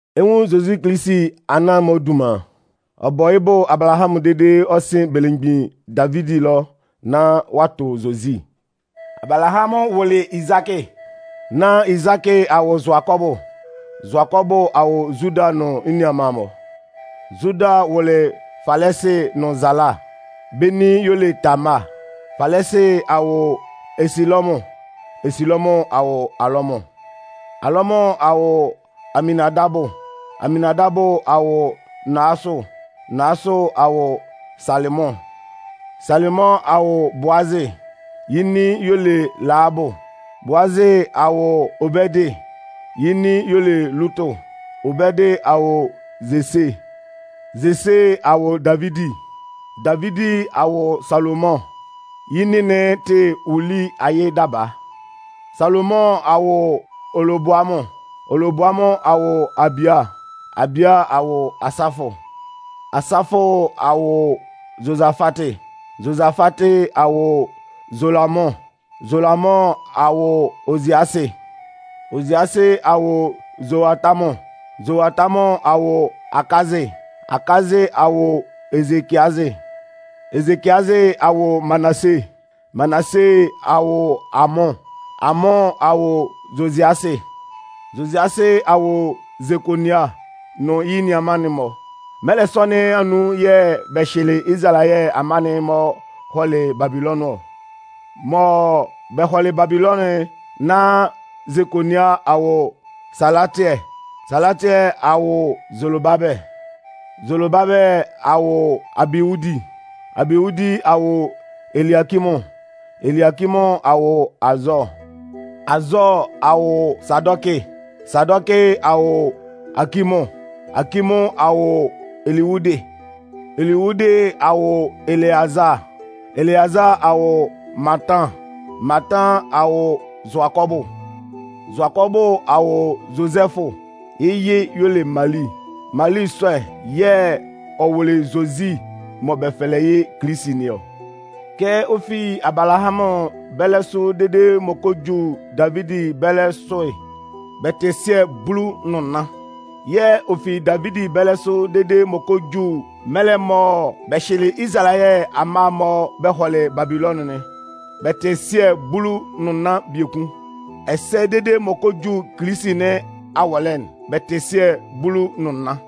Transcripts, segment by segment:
Ɛ 'nwun Zozi Kilisi anan-mɔ dunman'n, ɔ bɔ yɩ́ bʋ Abalahamʋn ɛlɔ dede ɔ sɩn belemgbin Davidi ɛlɔ nán ɔ'a tʋ Zozi. Abalahamʋn wʋlɩ Izakɩ, nán Izakɩ a wʋ Zʋakɔbʋ, Zʋakɔbʋ a wʋ Zuda nʋn yɩ́ nianman'n-mɔ, Zuda a wʋ Falɛsɩ nʋn Zala. Bɛ́ nin y'ɔ le Tamaa. Falɛsɩ a wʋ Ɛsɩlɔmʋn, Ɛsɩlɔmʋn a wʋ Alamʋn, Alamʋn a wʋ Aminnandabʋ, Aminnandabʋ a wʋ Naasʋn, Naasʋn a wʋ Salɩmʋn, Salɩmʋn a wʋ Boozɩ. Yɩ́ nin y'ɔ le Lahabʋ. Boozɩ a wʋ Obɛdɩ. Yɩ́ nin y'ɔ le Lutʋ. Obɛdɩ a wʋ Zese, Zese a wʋ Davidi, Davidi a wʋ Salomʋn. Yɩ́ nin'n tɩ Uli ayɩ daba. Salomʋn a wʋ Oloboamʋn, Oloboamʋn a wʋ Abia, Abia a wʋ Asafʋ, Asafʋ a wʋ Zozafatɩ, Zozafatɩ a wʋ Zolamʋn, Zolamʋn a wʋ Oziasɩ, Oziasɩ a wʋ Zoatamʋn, Zoatamʋn a wʋ Akazɩ, Akazɩ a wʋ Ezekiazɩ, Ezekiazɩ a wʋ Manase, Manase a wʋ Amʋn, Amʋn a wʋ Zoziasɩ, Zoziasɩ a wʋ Zekonia nʋn yɩ́ nianman'n-mɔ. Mɛlɛ sɔ nɩn anun yɛ̂ bɛ hyɩlɩ Izalayɛ amma'n-mɔ hɔlɩ Babilɔnʋn ɔ. Mɔ bɛ hɔlɩ Babilɔnʋn'n, nán Zekonia a wʋ Salatiɛ, Salatiɛ a wʋ Zolobabɛlɩ, Zolobabɛlɩ a wʋ Abiwudi, Abiwudi a wʋ Eliakimʋn, Eliakimʋn a wʋ Azɔɔ, Azɔɔ a wʋ Sadɔkɩ, Sadɔkɩ a wʋ Akimʋn, Akimʋn a wʋ Eliwudɩ, Eliwudɩ a wʋ Eleazaa, Eleazaa a wʋ Matan, Matan a wʋ Zʋakɔbʋ, Zʋakɔbʋ a wʋ Zozɛfʋ. Yɩ́ yɩ y'ɔ le Mali. Mali sɔ'n, yɩ́ yɛ̂ ɔ wʋlɩ Zozi mɔ bɛ fɛlɛ yɩ́ Kilisi nɩn ɔ. Kɛ ɔ fi Abalahamʋn bɛlɛ sʋ dede m'ɔ kɔ ju Davidi bɛlɛ sʋ'n, bɛ tɩ sɩɛ bulu nʋn nnan, yɛ̂ ɔ fi Davidi bɛlɛ sʋ dede m'ɔ kɔ ju mɛlɛ mɔ bɛ hyɩlɩ Izalayɛ amma'n-mɔ bɛ hɔlɩ Babilɔnʋn'n, bɛ tɩ sɩɛ bulu nʋn nnan biekun, ɛsɛ dede m'ɔ kɔ ju Kilisi nɩn awɔlɛ'n, bɛ tɩ sɩɛ bulu nʋn nnan.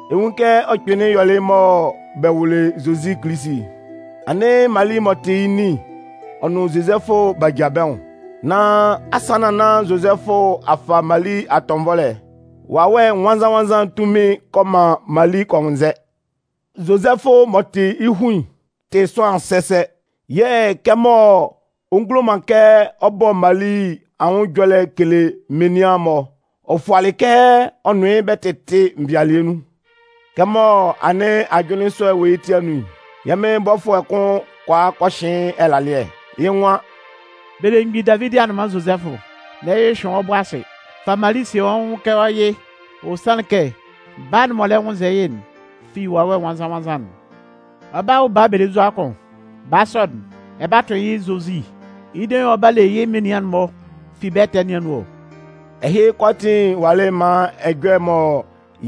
Ɛ 'nwun kɛ ɔ kpɩnlɩn yɔlɩ mɔ bɛ wʋlɩ Zozi Kilisi'n. Anɩn Mali m'ɔ tɩ yɩ́ nin'n, ɔ nʋn Zozɛfʋ b'a ja bɛ́ nwʋn. Nan asannan nán Zozɛfʋ a fa Mali atɔnvɔlɛ'n, Wawɛ Nwannzan-nwannzan'n tunmin'n kɔ man Mali kɔ nwʋnnzɛ. Zozɛfʋ m'ɔ tɩ yɩ́ hun'n tɩ sʋanlan sɛsɛ. Yɛ̂ kɛmɔ ɔ ngulo man kɛ ɔ bɔ Mali anwʋn ɛjɔlɛ ɔ kele menian'n-mɔ, ɔ fualɩ kɛ ɔ nʋn yɩ́ bɛ 'tɩtɩ nvɩalɩɛ nun. Kɛmɔ anɩn ajʋnlɩn sɔ'n wɔ yɩ́ ti anun'n, yɛ́ Mɩn bɔfʋɛ'n kʋn kɔ a kɔ hɩn yɩ́ ɛlalɩɛ. Yɩ́ nwan: “Belemgbin Davidi anʋnman Zozɛfʋ, n'ɛ hyʋhyʋɩn wɔ́ bʋ asɩ, fa Mali sie wɔ́ nwʋn kɛ wɔ́ yɩ. Ɔ sanlɩn kɛ baa'n m'ɔ lɛ nwʋnnzɛ yɩ́'n fi Wawɛ Nwannzan-nwannzan'n. Ɔ 'ba wʋ baa belenzua kʋn. Baa sɔ'n, ɛ 'ba tʋn yɩ́ Zozi, yɩ́ dein yɛ̂ ɔ 'ba le yɩ́ menian'n-mɔ fi bɛ́ ɛtɛ nɩn anun ɔ.” Ɛhɩ kʋalaatin walɩ maan ɛjɔlɛ'n mɔ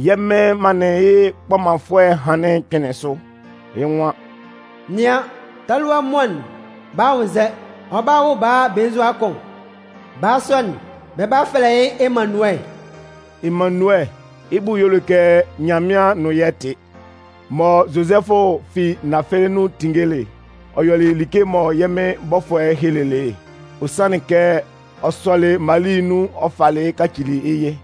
yɛ́ Mɩn manlɩn yɩ́ kpɔmanfʋɛ'n hanlɩn'n kpɩnlɩn sʋ. Yɩ́ nwan: Nɩan, talua muan'n 'ba nwʋnnzɛ, ɔ 'ba wʋ baa belenzua kʋn. Baa sɔ'n, bɛ 'ba fɛlɛ yɩ́ Emannuɛ. (Emannuɛ, yɩ́ bʋ y'ɔ le kɛ Nyanmɩan nʋn yɛ́ tɩ.) Mɔ Zozɛfʋ fi nafɛlɛ nɩn anun tinngelɩ'n, ɔ yɔlɩ like'n mɔ yɛ́ Mɩn bɔfʋɛ'n helelɩ yɩ́'n. Ɔ sɔlɩ Mali nun ɔ falɩ yɩ́ kacili yɩ́ yɩ.